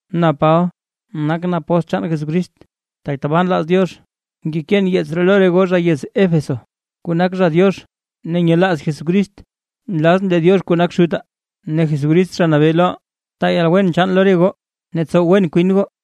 Na Paba, nakʼn apóstl chaan Jesucrist, tak tabaa nlaaz Diox. Ngekeen yeets ree lo re goo zha yez Éfeso, kuu nak zha Diox ne nyelaaz Jesucrist. Nlazʼn lee Diox kuu nak Xutaa ne Jesucrist Zha Nabee loʼaa, taa yalwen chaan lo re goo ne tsow wen kwin goo.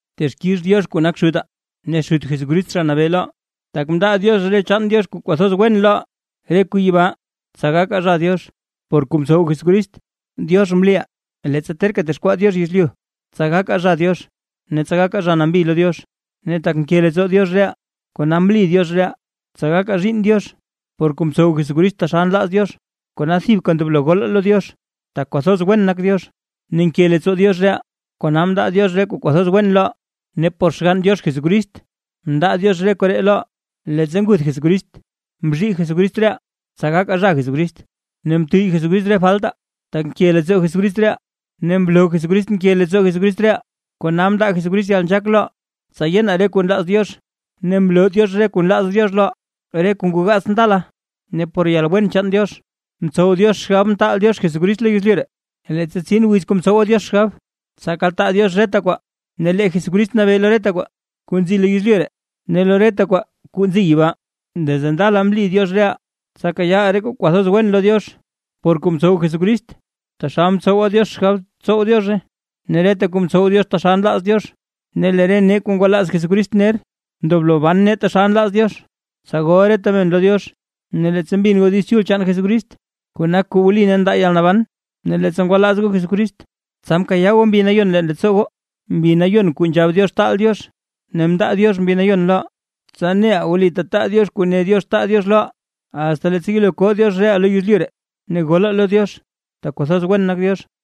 Texkix Diox kuu nak Xutaa ne Xut Jesucrist, Zha Nabee loʼaa, tak mndaa Diox re chaan Diox kuu kwathoz wen loʼaa, re kuu yibaa, tsa gakaa zha Diox, por kuu mtsow Jesucrist. Diox mliʼaa leettsa terka texkwaa Diox yezlyu, tsa gakaa zha Diox ne tsa gakaa zha nambi lo Diox. Ne tak nke leettsoo Diox reʼaa, kona mli Diox reʼaa, tsa gakaa zhiinn Diox, por kuu mtsow Jesucrist taxal nlaaz Diox. Kona thibka ndoblo golaa lo Diox, tak kwathoz wen nak Diox ne nke leettsoo Diox reʼaa; kona mndaa Diox re kuu kwathoz wen loʼaa ne por Xgann Diox Jesucrist mndaa Diox re koree loʼaa. Leettsa nguth Jesucrist mzhii Jesucrist reʼaa, tsa gakaa zha Jesucrist, ne mtuyy Jesucrist re faltaa, tak nke leettsoo Jesucrist reʼaa. Ne mloo Jesucrist nke leettsoo Jesucrist reʼaa, kona mndaa Jesucrist yalnzhaak loʼaa, tsa yenaa re kuu nlaaz Diox, ne mloo Diox re kuu nlaaz Diox loʼaa, re kuu ngoo gaats ndala, ne por yalwen chaan Diox mtsow Diox xgab mtaal Diox Jesucrist lo yezlyu ree. Leettsa tsin wiz kuu mtsowa Diox xgab tsa kaltaa Diox reta kwaa, ne lee Jesucrist nabee lo reta kwaa kuu nzi lo yezlyu ree ne lo reta kwaa kuu nzi yibaa. Desde ndala mli Diox reʼaa, tsa kayaaʼaa re kuu kwathoz wen lo Diox, por kuu mtsow Jesucrist, taxal mtsowa Diox xgab tsow Diozhe; ne reta kuu ntsow Diox taxal nlaaz Diox, ne lee re nee kuu ngwalaaz Jesucrist ner, ndoblo ban nee taxal nlaaz Diox, tsa gol reta men lo Diox. Ne leettsa mbin goo Diiz Chul chaan Jesucrist, kuu nak kuu wli ne ndaa yalnaban, ne leettsa ngwalaaz goo Jesucrist, tsa mkayaa goo Mbi Nayon leen leettsoo, Mbi Nayon kuu nzhab Diox taal Diox. Ne mndaa Diox Mbi nayon loʼaa, tsa neʼaa wli tetaa Diox kuu ne Diox taa Diox loʼaa, asta leettsa yelo koo Diox reʼaa lo yezlyu ree; ne golaa lo Diox tak kwathoz wen nak Diox.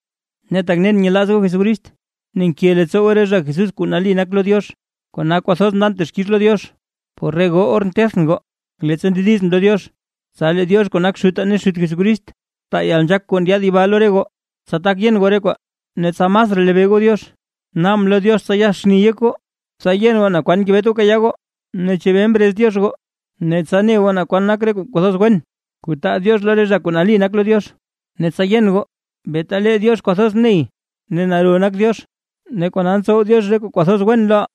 Ne tak nen nyelaaz goo Jesucrist, ne nke leettsoo goo re zha Jesús kuu nali nak lo Diox, kona kwathoz ndan texkix lo Diox por re goo or ntethʼn goo, leettsa ndedizʼn lo Diox. Tsa lee Diox kuu nak Xutaa ne Xut Jesucrist, taa yalnzhaak kuu ndyaad yibaa lo re goo, tsa tak yen goo re kwaa ne tsa masraa lebee goo Diox. Naabʼn lo Diox tsa yaxni yek goo, tsa yen goo naa kwan ngebet goo kayaa goo, ne chebee mrez Diox goo, ne tsa ne goo naa kwan nak re kuu kwathoz wen, kuu taa Diox lo re zha kuu nali nak lo Diox. Ne tsa yen goo beeta lee Diox kwathoz ney ne naro nak Diox, kona ntsow Diox re kuu kwathoz wen loʼaa,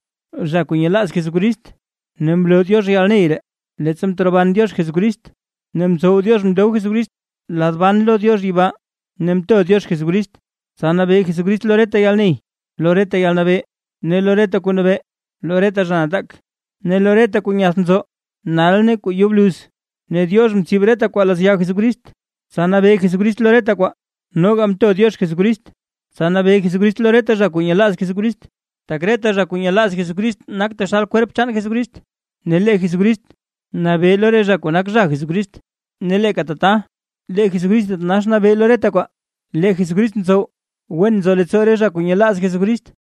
zha kuu nyelaaz Jesucrist. Ne mloo Diox yalney ree, leettsa mteroban Diox Jesucrist, ne mtsow Diox mndob Jesucrist lad ban lo Diox yibaa. Ne mto Diox Jesucrist, tsa nabee Jesucrist lo reta yalney, lo reta yalnabee, lo reta zha kuu nabee, lo reta zha nataak, ne lo reta kuu nyath nzo nal ne kuu yo bluz. Ne Diox mloo reta kwaa lazya Jesucrist, tsa nabee Jesucrist lo reta kwaa, noga mto Diox Jesucrist, tsa nabee Jesucrist lo reta zha kuu nyelaaz Jesucrist. Tak reta zha kuu nyelaaz Jesucrist nak taxal kwerp chaan Jesucrist, ne lee Jesucrist nabee lo re zha kuu nak zha Jesucrist, ne leeka tata, lee Jesucrist thitanax nabee lo reta kwaa. Lee Jesucrist ntsow wen nzo leettsoo re zha kuu nyelaaz Jesucrist.